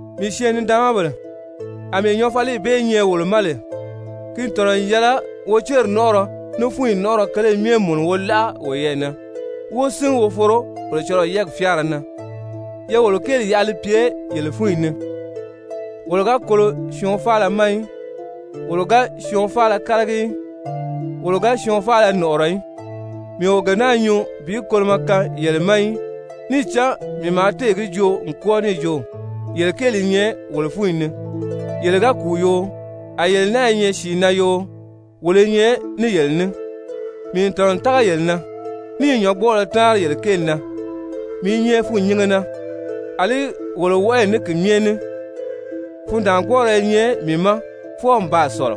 Mii syɛɛn-nidaanmabèle, àmɛɛ nyɔɔfaliyi bee nyɛ wolo ma lè, ki n tɔ̀nɔ n yɛlɛ wo céri nɔ́nʔɔrɔ ní fúnyi nɔ́nʔɔrɔ kele myɛ mùnu wo láʔa woyɛɛ na, wó sín wo foro Kolocɔlɔɔ yɛ́ɛgi fyáara na. Ye wolo kéeli yaʔa li pye yele fúnyi ni! Wolo ga kolo syɔɔn faala ma í, wolo ga syɔɔn faala kálagi í, wolo ga syɔɔn faala nɔ̀ʔɔrɔ í. Mii o gee naa nyuu bi kolomɔ kaan yele ma í, níì cán mii maa téè gi joo n kwɔ́ɔ níì jo yele kéeli i nyɛ wolo fúnyi ni, yele ga kùu yoo, a yele náa i nyɛ sìi na yoo, wolo i nyɛ ní yele ní. Mii n tɔ̀nɔ n tága yele na, ní i nyɔ̌ngbɔɔlɔ táanri yele kéeli na, mii i nyɛ fûnnyinge na, àlí wolo wɔʔɔyi ní ki myɛ ní, fundaangbɔɔrɔ i nyɛ mii ma fwɔɔ n baa sɔ̀lɔ.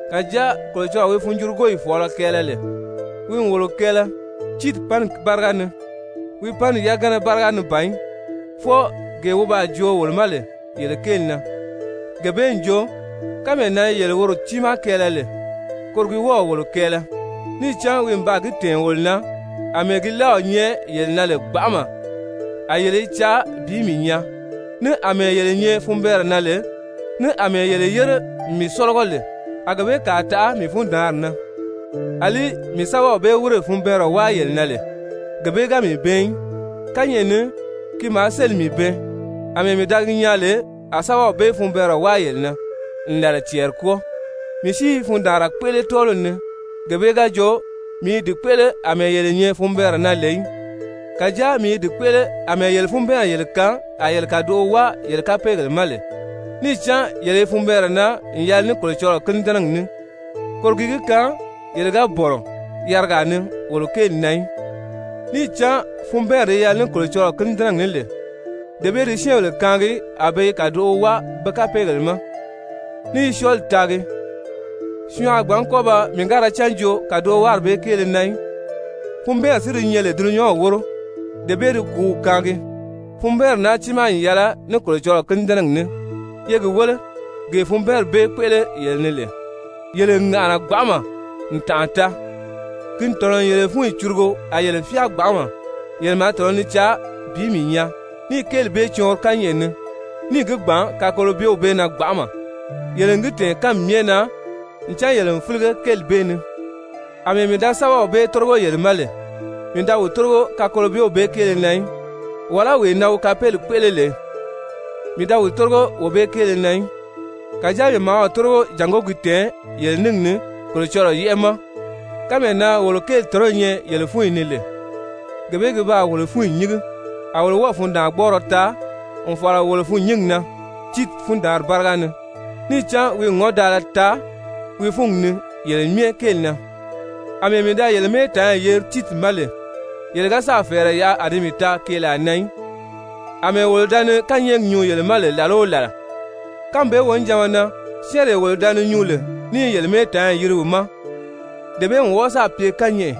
Kàjáa Kolocɔlɔɔ wi funjurugoyi fɔ̀ɔlɔ kɛɛlɛ lè, wi n wolo kɛɛlɛ Tiiti panni báriga ni. Wi panni yagana báriga ni si ban í, fwɔɔ gee wi baa joo wolo ma lè yele kéeli na, gee bee n jo, kánmee na yele woro tiimaa kɛɛlɛ lè, koro gi wɔ́ɔ̀ wolo kɛɛlɛ, níì cán wi n baa gi tɛ̀ɛn wolo na àmɛɛ gi láaw nyɛ yele na lè gbanʔama a yele i caa bi mii nyaa, ní àmɛɛ yele nyɛ funbɛɛnrɛ na lè, ní àmɛɛ yele yére n mii sɔ́lɔgɔ lè, a gee bee kàa taʔa mii fundaanri na. Alí mii sɛ́bɛw bee wírè funbɛɛnrɛ wáa yele na lè, gee bee ga mii bɛɛn í. Kányɛʔɛ ni ki maa sélì mii bɛɛn àmɛɛ mii da gi nyaa lè a sɛ́bɛw bee funbɛɛnrɛ wáa yele na n làla cɛɛri kwɔ́ɔ, mii si i fundaanra kpéʔele tɔ́ɔliw ni, gee bee ga jo mii i di kpéʔele àmɛɛ yele nyɛ funbɛɛnrɛ na lè í, kàjáa mii i di kpéʔele àmɛɛ yele funbɛɛnri yele kaan a yele kàdoʔo wáa yele kapeegèle ma lè. Níì cán yele funbɛɛnri naa n yɛlɛ ní Kolocɔlɔɔ kínidɛnɛgi ní, koro gi gi kaan yele ga bɔ̀nɔ yarigaa ni wolo kéeli na í. Níì cán funbɛɛnri di yɛlɛ ní Kolocɔlɔɔ kínidɛnɛgi ní lè, dee bee di syɛ́ɛnbèle kaangi a be i kàdoʔo wáa be kapeegèle ma, ní i syɔɔli taagi, syɔɔn a gbǎn kɔ́ ba mii-ga-ra-cán joo kàdowaari bee kéele na í, funbɛɛnri si di nyɛ lè dulunyanw wóro, dee bee di kùúw kaangi. Funbɛɛnri naa tiimaa n yɛlɛ ní Kolocɔlɔɔ kínidɛnɛgi ní, ye gi wéle gee funbɛɛnri bee kpéʔele yele ni lè. Yele n ŋàʔana gbanʔama n tànʔa taa! Ki n tɔ̀nɔ n yele fúnyi curugo, a yele fyáa gbanʔama, yele maa tɔ̀nɔ ni caa bi mii nyaa, níì kéeli bee cɔɔnri kányɛʔɛ ni, níì gi gbàn kakolobyew bee na gbanʔama! Yele n gi tɛ̀ɛn kánmi myɛ na ncan yele n fílige kéeli bee ni. Amɛɛ mii da sɛ́bɛw bee tórigo yele ma lè, mii da wi tórigo kakolobyew bee kéele na í, wàlá wee na wi kapeeli kpéʔele lè, mii da wi tórigo wee bee kéele na í, kàjáa mii maa wi tórigo jàngó gi tɛ̀ɛn yele ningi ni Kolocɔlɔɔ yɛ́ʔɛ ma kánmee na wolo kéeli tɔ̀nɔ́ nyɛ yele fúnyi ni lè. Gee bee gi baa wolo fúnyi nyíngi. A wolo wɔ́ɔ̀ fundaangbɔɔrɔ taa n fàra wolo fûnnyingi na Tiiti fundaanri báriga ni, níì cán wi n ŋɔ́ndaala taa wi fúngi ni yele myɛ kéeli na. Amɛɛ mii da yele mɛ́ɛtaanyi yeri Tiiti ma lè, yele ga sáà fɛ̀ɛrɛ yaʔa a di mii taa keelaa na í. Amɛɛ wolo da ni kányɛɛgi nyuu yele ma lè làla o làla, kánmi bee wonijanma na syɛ́ɛnree wolo da ni nyuu lè ní i yele mɛ́ɛtaanyi yiri wi ma, dee bee n wɔ́ɔ sáà pye kányɛʔɛ,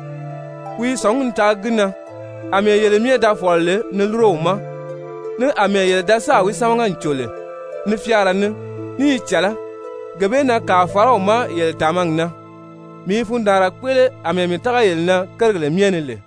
wi i sɔ̀ngí ni taagi gi na àmɛɛ yele myɛ da fɔ̀lɔ lè ni lúro wi ma, ní àmɛɛ yele da sáà wi sámaga n cò lè ní fyáara ní, ní i cɛ̀lɛ́, gee bee na kàa fàra wi ma yele tàmagi na. Mii i fundaanra kpéʔele àmɛɛ mii tága yele na kérigèle myɛ ni lè.